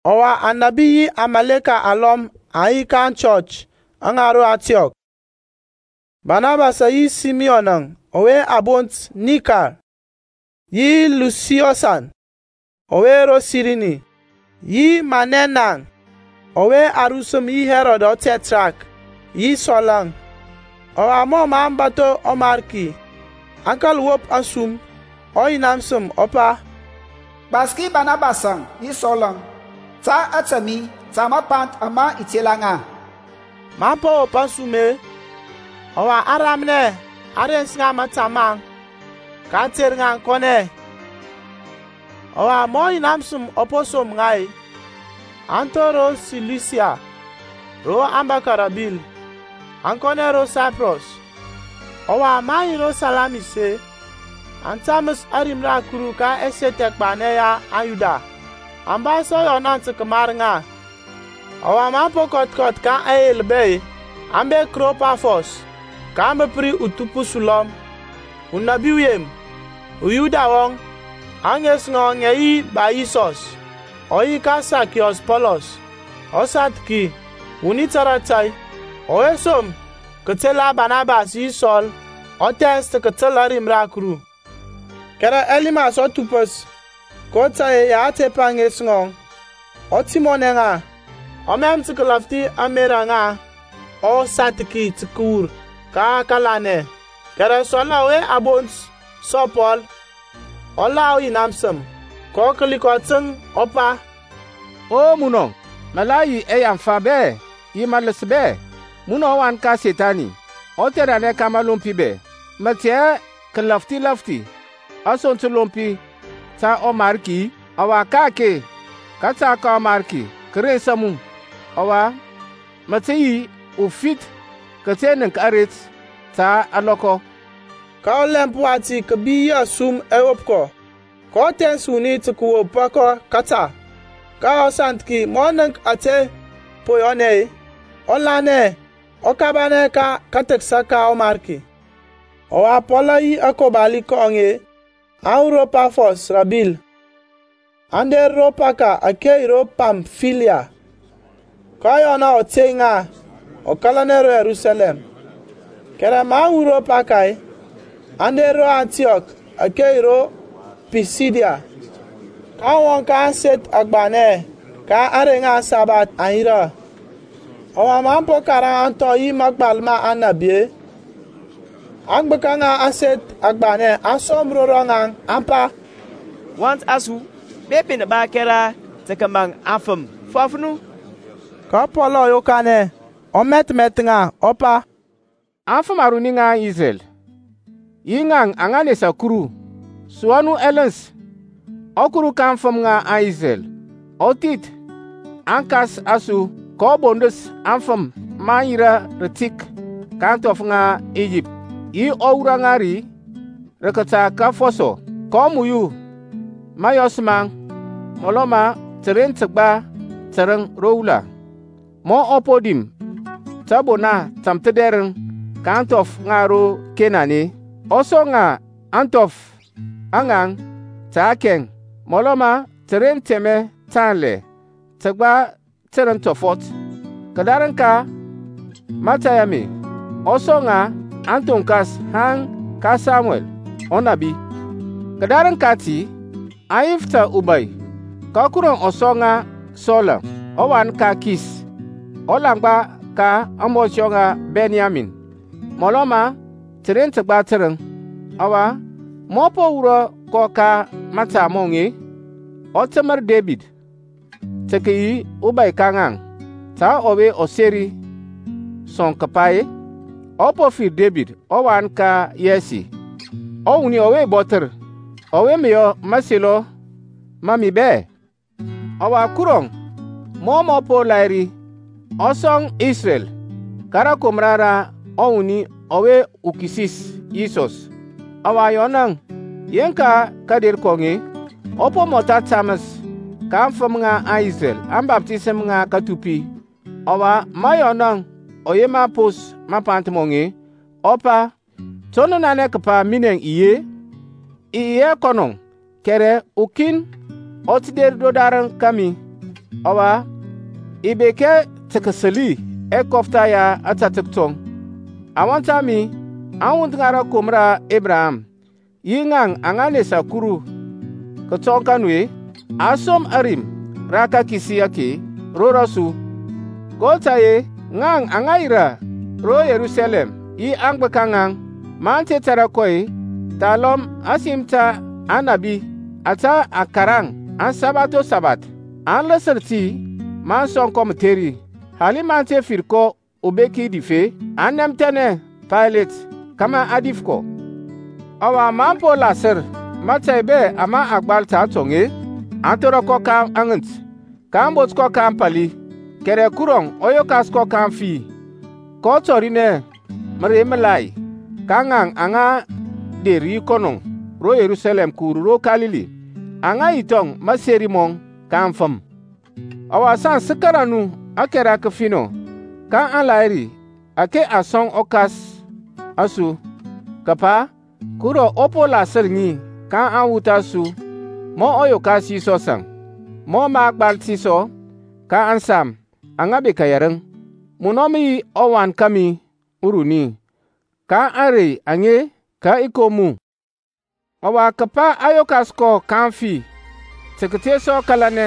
Ɔwa anȧbi yi akarmɔkɔ alɔm aŋ yi ka aŋchɔch ŋa ro Antiɔk, Banabasȧŋ yi Simiyɔnȧŋ ɔwe a bont Nikər, yi Lusiɔsȧŋ ɔwe ro Sirini yi Manɛnȧŋ ɔwe a rusəm yi Hɛrɔd ɔTɛtrark, yi Sɔlȧŋ. Ɔwa mɔ mə aŋ bȧtho ɔMarki, aŋ kȧl wop asum, ɔYina məsəm ɔ pa, Gbaski Banabasȧŋ yi Sɔlȧŋ ta ȧtȧ mi ta mapanth ama i tela ŋa. Maŋ po wop asum-e, ɔwa aŋ ramnɛ, aŋ rens ŋa mȧta maŋ, kaŋ ter ŋa aŋ kɔnɛ. Ɔwa, ma ɔYina məsəm ɔ po som ŋa-e, aŋ thor ro Silusiya, ro aŋ bȧkȧ rə abil, aŋ kɔnɛ ro Saiprɔs. Ɔwa, maŋ yi ro Salamis-e, aŋ taməs ȧrim ra Kuru ka ɛseth ɛgbanɛ ya aŋYuda; aŋ ba sɔ Yɔnȧŋ tə kəmar ŋa. Ɔwa maŋ po kɔth kɔth ka aŋyel bɛ-e, aŋ bek ro Pafɔs, kaŋ bəp ri uthupəs ulɔm, unabi uyem, uYuda wɔŋ, ȧŋes ŋɔŋ ŋə yi Ba-Yisɔs. Ɔ yi ka Sakiyɔs Pɔlɔs, ɔsanthiki, wuni tȧrȧ tȧy, ɔwe som kətela Barnabas yi Sɔl, ɔ thɛns tə kətəl ȧrim ra Kuru. Kɛrɛ Elimas ɔthupəs (kotȧy-e ya a tepa ȧŋes ŋɔŋ) ɔ təmɔnɛ ŋa, ɔ mɛm tə kəlafthi ȧŋmerȧ ŋa ɔsanthiki kəwur ka kȧlanɛ. Kɛrɛ Sɔl-əŋ ɔwe a bont sɔ Pɔl, ɔ la ɔYina məsəm, kɔ kəli kɔ təŋ, ɔ pa, O munɔ, mə la ɛyaŋfa bɛ yi mələs bɛ, munɔ ɔwan ka Sethani, utheranɛ ka məlompi bɛ, mə tey hɛ kəlafthi lȧfthi asoŋ təlompi ta ɔMariki-i? Ɔwa ka-ake kȧta ka ɔMarki kə rensa mu, ɔwa mə tə yi ufith kəte nənk aret ta alɔkɔ. Ka ɔlɛmp wati kȧbi yi asum ɛ wop kɔ, kɔ thɛns wuni tə kəwopa kɔ kȧta. Ka ɔsanthiki, ma ɔ nənk ȧtȧ po yɔnɛ-e, ɔ lanɛ, ɔ kabanɛ ka kathəksa ka ɔMarki. Ɔwa Pɔlȧŋ yi akobali kɔŋ aŋ wur ro Pafɔs rə abil, aŋ der ro Paka ȧke yi ro Pamfiliya; ka Yɔnȧŋ ɔ tey ŋa, ɔ kȧlanɛ ro Yerusalɛm. Kɛrɛ maŋ wur ro Paka-e, aŋ der ro Antiɔk ȧke yi ro Pisidia. Kaŋ wɔŋ ka ȧŋseth agbanɛ ka ȧŋrey ŋa aŋsabath, aŋ yirȧ. Ɔwa maŋ po karaŋ ȧŋthɔ yi mȧgbal ma Aŋnȧbi, aŋgbəka ŋa ȧŋseth agbanɛ aŋ som ro rɔŋaŋ, aŋ pa, Wɔnt a su, bepi nə ba kɛra tə kəmaŋ aŋfəm, fɔf nu. Ka Pɔlȧŋ ɔ yokanɛ, ɔ mɛthmɛth ŋa, ɔ pa, Afəm aruni ŋa Isrɛl, yi naŋ aŋa nesa Kuru, sua nu ɛləns. ƆKuru ka aŋfəm ŋa Isrɛl, ɔ thith aŋkas a su, kɔ bondəs aŋfəm maŋ yirȧ rətik ka ȧŋthɔf ŋa Iyipt, yi ɔ wurɔ ŋa ri rə kȧta ka afɔsɔ. kɔ muyu mȧyɔs maŋ mɔlɔ ma təren təgba tərəŋ ro wula. Ma ɔ po dim tȧbona tȧmthədɛrəŋ ka ȧŋthɔf ŋa ro Kenan-e, ɔ sɔŋ ŋa ȧŋthɔf a ŋaŋ ta kɛŋ, mɔlɔ ma təren tɛmɛ tanlɛ təgba tərəŋ tɔfɔt. Kədarəŋ ka mȧtȧy ame ɔ sɔŋ ŋa ȧthonkas haŋ ka Samuɛl ɔnȧbi. Kədarəŋ kati aŋ yif ta ubȧy, ka Kuru ɔ sɔŋ ŋa Sɔl-əŋ ɔwan ka Kis, ulaŋgba ka ȧŋbɔnshɔ ŋa Bɛnyamin, mɔlɔ ma təren təgba tərəŋ. Ɔwa ma ɔ po wurɔ kɔ ka matəma mɔŋ-e, ɔ təmər Debid tə kəyi ɔbȧy ka ŋaŋ, ta ɔwe ɔ seri sɔ kəpa-e, I po fir Debid ɔwan ka Yɛsi, ɔwuni ɔwe i bɔthər, ɔwe mə yɔ mȧselɔ ma mi bɛ. Ɔwa Kurɔŋ mɔ mɔ po lahiri, ɔ sɔŋ Isrɛl ka rȧkomra ra ɔwuni ɔwe, uKisis, Yisɔs. Ɔwa Yɔnȧŋ, yeŋka kȧder kɔŋ-e, ɔ po mɔtha taməs ka aŋfəm ŋa Isrɛl ȧŋbaftisəm ŋa kathupi. Ɔwa ma Yɔnȧŋ ɔ yema pons mapanth mɔŋ-e, ɔ pa, To nə nanɛ kəpa minɛ i yi-e? I yi hɛ kɔnɔ, kɛrɛ ukin ɔ tə der kədarəŋ kȧmi, ɔwa i bek hɛ tə kəsəli ɛkɔftha ya ȧtȧtək tɔŋ. Awɔnt a mi, aŋwuth ŋa rȧkomra ra Ebraham, yi ŋaŋ aŋa nesa Kuru kətɔŋ ka nu-e, a som ȧrim ra kakisi ake ro rɔsu. kotȧy-e ŋaŋ aŋa yirȧ ro Yerusalɛm, yi aŋgbəka ŋaŋ, maŋ te tȧrȧ kɔ-e, thalɔm ȧsim ta Aŋnȧbi ȧtȧ a karaŋ asabath o sabath, aŋ lasər ti maŋ sɔŋ kɔ mətheri. Hali maŋ te fir kɔ ubeki dif-e, aŋ nɛmthɛnɛ Paylet kȧmȧ a dif kɔ. Ɔwa maŋ po lasər mȧtȧy bɛ ama a gbal ta atɔŋ-e, aŋ thora kɔ ka aŋənt, kaŋ bot kɔ ka ȧŋpȧli. Kɛrɛ Kurɔŋ ɔ yokas kɔ ka aŋfi, kɔ tɔrinɛ mərey məlai ka ŋaŋ aŋa der yi kɔnɔ ro Yerusalɛm kəwur ro Kalili, aŋa yi thɔŋ maseri mɔŋ ka aŋfəm. Ɔwa saŋ sə kȧrȧ nu ȧkɛra kəfinɔ ka aŋlahiri ȧke a sɔŋ aŋkas a su, kəpa Kuru ɔ po lasər ŋi ka aŋwuth a su ma ɔ yokas Yisɔsȧŋ; mɔ mə a gbal ti sɔ ka ȧŋSam aŋa bekȧ yɛrəŋ, Munɔ mə yi ɔWan kȧmi uruni; ka ȧŋrey aŋe kə i kom mu. Ɔwa, kəpa ɔ yokas kɔ ka aŋfi tə kəte sɔ kȧlanɛ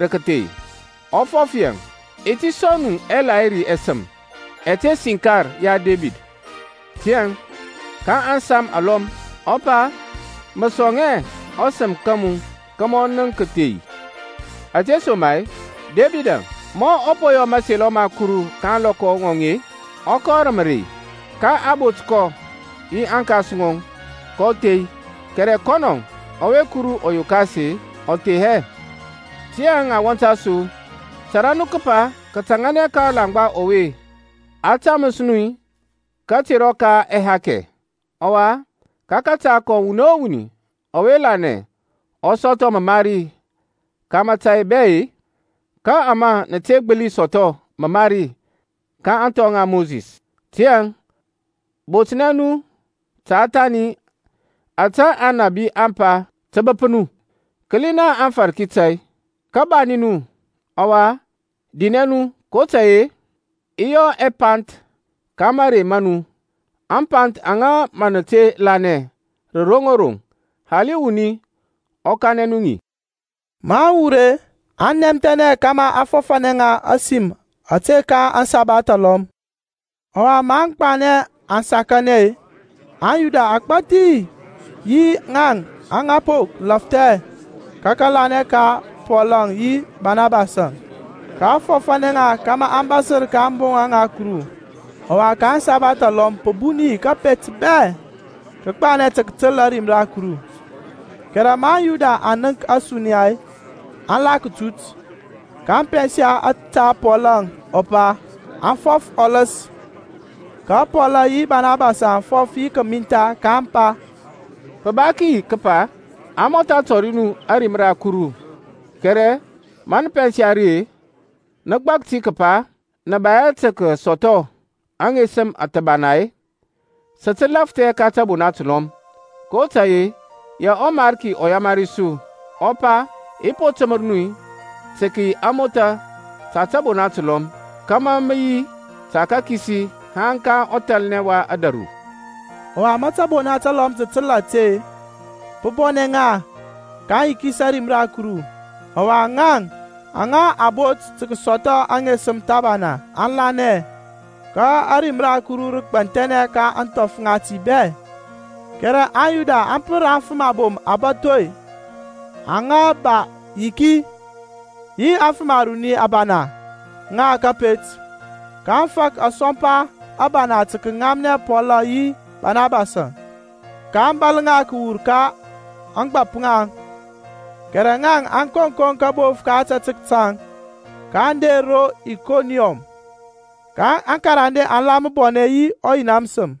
rə kəthei, ɔ fɔf yaŋ, I ti sɔŋ nu ɛlahiri ɛsəm ɛte siŋkar ya Debid. Tiyȧŋ ka ȧŋSam alɔm ɔ pa Mə sɔŋ hɛ ɔSəm ka mu kȧmȧ ɔ nənk kəthei. Ȧtesoma-e Debidȧŋ, ma ɔ po yɔ mȧselɔ ma Kuru ka ȧŋlɔkɔ ŋɔŋ-e, ɔ kɔ rə mərey, ka a bot kɔ yi aŋkas ŋɔŋ, kɔ thei. Kɛrɛ kɔnɔŋ, ɔwe Kuru ɔ yokas-e, ɔ thei hɛ. Tiyȧŋ awɔnt a su, tȧrȧ nu kəpa kətȧŋȧnɛ ka ɔlaŋgba ɔwe a taməs nu katerɔ ka ɛhakɛ; ɔwa ka kȧta kɔŋ wuni o wuni ɔwe lanɛ ɔ sɔthɔ məmari ka mȧtȧy bɛ-e, ka ama nə te gbəli sɔthɔ məmari ka ȧŋthɔ ŋa Mosis. Tiyȧŋ botnɛ nu ta thani ȧtȧ Aŋnȧbi aŋ pa tə bəp nu, Kəla naŋ afarki tȧy, Kabanɛ nu ɔwa dinɛ nu; kotȧy-e i yɔ apanth ka marey ma nu, Apanth aŋa mə nə te lanɛ rə roŋ o roŋ, Hali wuni ɔ kanɛ nu ŋi. Maŋ wur-e, aŋ nɛmthɛnɛ kȧmȧ a fɔfȧnɛ ŋa ȧsim ȧte ka aŋsabath alɔm. Ɔwa ma aŋgbanɛ aŋ sakanɛ-e, aŋYuda agbȧthi yi ŋaŋ aŋa po lafthɛ ka kȧlanɛ aŋ tȧŋ Pɔlȧŋ yi Banabasȧŋ, kaŋ fɔfȧnɛ ŋa kȧmȧ aŋ bȧsər ka ȧŋboŋa ŋa Kuru. Ɔwa ka aŋsabath alɔm pə bun yi kȧpet bɛ kə gbanɛ tə kətəl ȧrim ra Kuru. Kɛrɛ ma aŋYuda aŋ nənk ȧsuniya-e, aŋ la kətut, kaŋ pɛnsa ȧtȧ Pɔlȧŋ ɔ pa, aŋ fɔf ɔləs. Ka Pɔl yi Banabasȧŋ aŋ fɔf yi kəmintha, kaŋ pa, Pə ba kəyi kəpa a mɔtha tɔri nu ȧrim ra Kuru; kɛrɛ ma nə pɛnsa ri-e, nə gbək ti kəpa nə bek hɛ tə kəsɔthɔ aŋesəm thəbana-e, sə tə lafthɛ ka tȧbona təlɔm. kotȧy-e ya ɔMarki ɔ yamari su, ɔ pa, I po təmər mu tə kəyi amotha ta tȧbona təlɔm, Kama mə yi ta kakisi haŋ ka ɔthalnɛ wa ȧdȧru. Ɔwa ma tȧbona təlɔm aŋ təl ȧte-e, pə bɔnɛ ŋa, kaŋ yikis ȧrim ra Kuru; ɔwa ŋaŋ aŋa a bot tə kəsɔthɔ aŋesəm thəbana, aŋ lanɛ. Ka ȧrim ra Kuru rə gbanthɛnɛ ka ȧŋthɔf ŋati bɛ. Kɛrɛ aŋYuda aŋ pər aŋfəm abom abȧtho-e aŋa ba yiki, yi aŋfəm aruni abana ŋa kȧpet, kaŋ fak asɔmpa abana tə kəŋamnɛ Pɔl yi Banabasȧŋ, kaŋ bȧl ŋa kəwur ka ȧŋgbȧp ŋaŋ. Kɛrɛ ŋaŋ, aŋ koŋkoŋ kabof ka ȧtȧtək taŋ, kaŋ der ro Ikoniɔm. Ka aŋkarande aŋ la məbɔnɛ yi ɔYina məsəm.